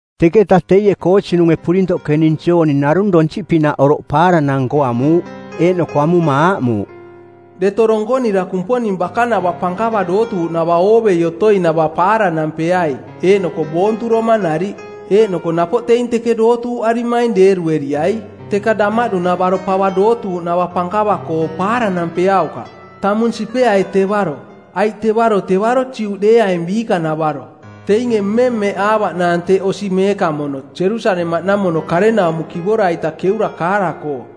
Teketa teie koosinunge purintoꞌke ning Jooni narung donsiꞌpinaꞌ oroꞌ paaranang-nko amuuꞌ, eeꞌnoko amuma aaꞌmuuꞌ, “Deto donkonira Kumponing bakanava pankava dootuuꞌnava oovei otoinava paaranampeai eeꞌnoko boonturoma nariꞌ. Eeꞌnoko napoꞌ teing teke dootuuꞌarimaing deerueriai. Teka damaꞌdu-navaro pava dootuuꞌnava pankava-koo paaranampeaukaꞌ. Tamung sipeai tevaro, aiꞌ tevaro tevaro Juꞌdeeaing biikanavaro. Teinge mmemmeꞌaavaꞌnaang teꞌ osi meekamono, Jerusalemaꞌnamono karenaumo kivora-ita keura kaara-koo.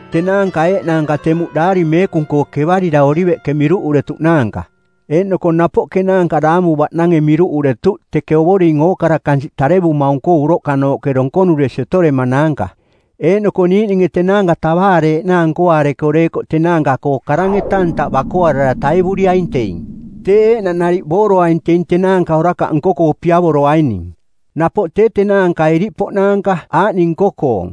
Tenaanka eeꞌnaanka temuꞌ Daari Meekung-koo kevarira oliveꞌke miruꞌuretuꞌnaanka, eeꞌnoko napoꞌ kenaanka daamu-baꞌnange miruꞌuretuꞌ teke Ovoring ookara kansiꞌ tarevumaung-koo uroꞌkanooꞌke donkonuresi otoremanaanka. Eeꞌnoko niiꞌninge tenaanka tavaareeꞌnaang nkoaareko deekoꞌ tenaanka-koo karang-eta ntaꞌ bakoarara taivuriaing teing. Teeꞌ eeꞌnaꞌ nariꞌ booroaing teing tenaanka orakaꞌ nko-koo piavoroaining. Napoꞌ tee tenaanka iriꞌpoꞌnaanka aaꞌning nko-koong: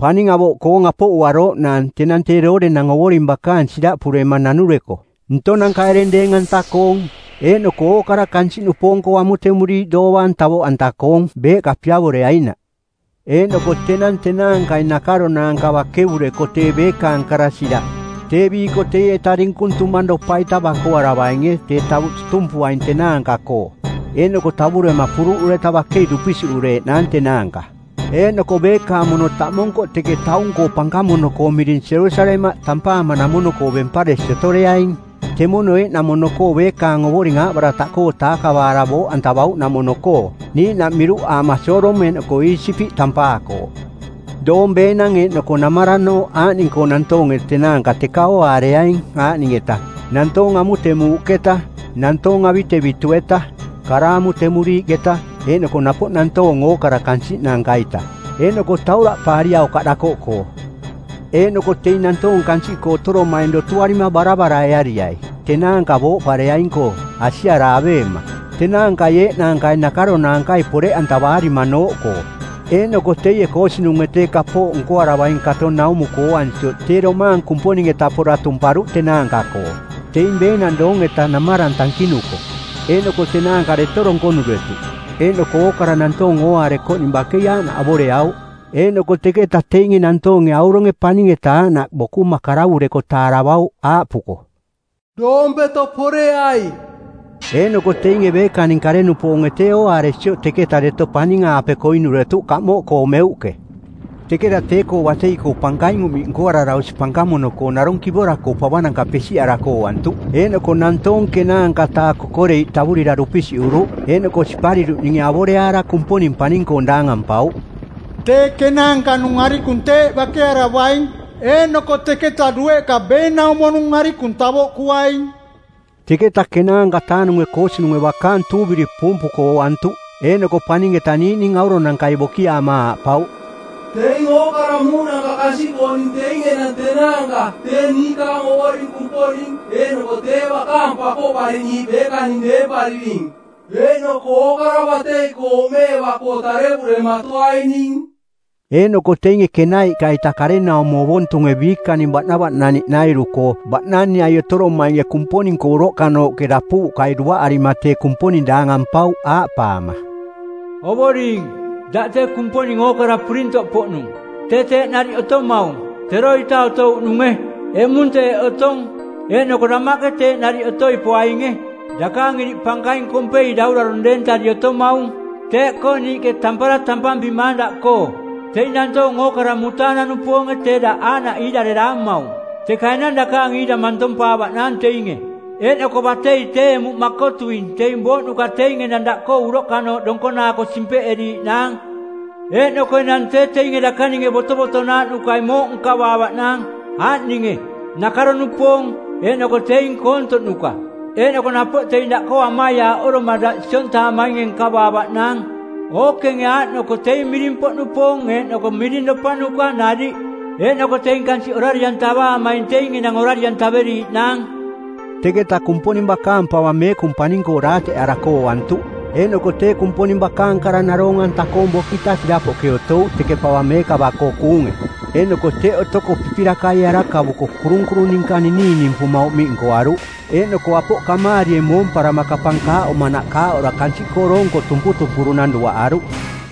paning avoꞌkoong apoꞌuarooꞌnaang tenang tee doorenang Ovoring bakaang siraꞌpurema nanureko, ntonanka ereng deeng-anta-koong, eeꞌnoko ookara kansiꞌnupoong-koo amutemuriiꞌ doovaang tavoꞌanta-koong beeꞌka piavoreainaꞌ. Eeꞌnoko tenang tenaankai nakaronaanka bakevureko tee beekaang kara siraꞌ, tee biiko teieta dinkung tumangropa-ita bakoaravainge tee tavuꞌ tutumpuaing tenaanka-koo, eeꞌnoko tavurema puruꞌureta bakei dupisiꞌureeꞌnaang tenaanka. Eeꞌnoko beekaang mono taꞌmonkoꞌ teke taung-koo pankamono-koo miring Jerusalemaꞌ tampaamanamono-koo bemparesi otoreaing, temono eeꞌnamono-koo beekaang Ovoring aaꞌbarataꞌkoo taakavaara booꞌantavauꞌnamono-koo, niiꞌnaꞌ miruꞌaama Sodom eeꞌnoko Iisipiꞌ tampaakooꞌ. Doong beenang eeꞌnoko namaranooꞌ aaꞌning-koo nantoonge tenaanka teka ooaareaing aaꞌning-eta: nantoong amutemuuꞌketa, nantoong avitevitu-eta, kara amutemuriiꞌketa eeꞌnoko napoꞌ nantoong ookara kansiꞌnanka-ita. Eeꞌnoko tauraꞌpaariaukaꞌ dakoꞌkoo. Eeꞌnoko teing nantoong kansiꞌkoo otoromaing dotuarima baravaraeariai˜ tenaanka booꞌpareaing-koo, asiara aveema, tenaankai eeꞌnaankai nakaronaankai poreꞌantavaarimanooꞌkoo.” Eeꞌnoko teie koosinunge tee kapooꞌ nkoaravaing kato naumuko ooansioꞌ tee domaang Kumponing-eta pora tumparuꞌ tenaanka-koo, teing beenang doong-eta namarang tankinuko. Eeꞌnoko tenaanka deto donkonuretuꞌ, eeꞌnoko ookara nantoong ooaarekoꞌning bakei aaꞌnaꞌ avoreauꞌ. Eeꞌnoko teketa teinge nantoonge auronge paning-eta aaꞌnaꞌ bokuma karavureko taaravauꞌ aaꞌpuko, “Doompeto poreai.” Eeꞌnoko teinge beekaning kare-nupoonge tee ooaaresioꞌ teketa deto paning-aape koinuretuꞌ kamoꞌkoo meuꞌke. Teketa tee-koo batei-koo pankaing uꞌmiꞌ nkoarara osi pankamono-koo narung kivora-koo pavananka pesiꞌarako ooantuꞌ, eeꞌnoko nantoong ˜kenaanka-taa kokoreiꞌ tavurira dupisiꞌuruꞌ, eeꞌnoko sipariruꞌninge avoreaara Kumponing paning-koong daangampauꞌ. Tee kenaanka-nung arikung teeꞌ bakearavaing, eeꞌnoko teketa dueꞌka beenaumo-nung arikung tavoꞌkuaing. Teketa ˜kenaanka-taa-nunge koosinunge bakaang tuuviri puumpuko ooantuꞌ, eeꞌnoko paning-eta niiꞌning auronankai bokiaama aaꞌpauꞌ, “Teing ookara muuꞌnanka kansiꞌkooning teing enang tenaanka tee niikaang Ovoring Kumponing eeꞌnoko tee bakaang Pakoꞌpariꞌniiꞌ beekaning deempariring, eeꞌnoko ookara batei-koo oꞌmeeva-koo tarevurematoaining.” Eeꞌnoko teinge kenaiꞌka-ita karenaumo ovontunge biikaning baꞌnavaꞌnaniꞌnairu-koo baꞌnaniꞌai otoromainge Kumponing-koo uroꞌkanooꞌke dapuuꞌkai duaꞌarima tee Kumponing daangampauꞌ, aaꞌpaama, “Ovoring, daꞌ tee Kumponing ookara purintoꞌpoꞌnung, tee teeꞌ nariꞌ otomaung-teroita otouꞌnunge, eꞌmung teeꞌ otong, eeꞌnoko damaꞌke teeꞌ nariꞌ otoi poainge. Dakaang iriꞌ pankaing kompei daurarong˜ deentari otomaung. Teeꞌkoo niiꞌke tampara tampampimaang daꞌkoo. Teing nantoong ookara mutaanang-nupoonge tee daꞌ aaꞌnaꞌ iirareraamaung, teka enang dakaang iira mantompaavaꞌnaang teinge, eeꞌnoko batei tee emuꞌ makotuing teing booꞌnuka teing enang daꞌkoo uroꞌkanooꞌ donkonaako simpeꞌeriiꞌnaang. Eeꞌnoko enang tee teinge dakaninge botovotonaaꞌnukai mooꞌ nkavaavaꞌnaang, aaꞌninge: nakaro-nupoong, eeꞌnoko teing koontoꞌnuka, eeꞌnoko napoꞌ teing daꞌkoo amaiaaꞌoroma daꞌ siontaamainge nkavaavaꞌnaang, ookenge aaꞌnoko teing miring-poꞌnupoong eeꞌnoko miringropanuka nariꞌ. Eeꞌnoko teing kansiꞌ orari-antavaamaing teing enang orari-antaveriiꞌnaang.” Teketa Kumponing bakaang pava meekung paning-koo daateꞌarako ooantuꞌ, eeꞌnoko tee Kumponing bakaang kara naroong-anta koong bokita sirapoꞌke otouꞌ teke pava meekava-koo kuunge, eeꞌnoko teꞌ otoko pipirakaie arakavuko kurunkurung ninka ninininimpuma uꞌmiꞌ nkoaruꞌ eeꞌnoko apoꞌ kamaarie moomparama kapang kaaꞌomanaꞌ kaaꞌora kansiꞌkoo doonko tumputumpurunang duaꞌaruꞌ.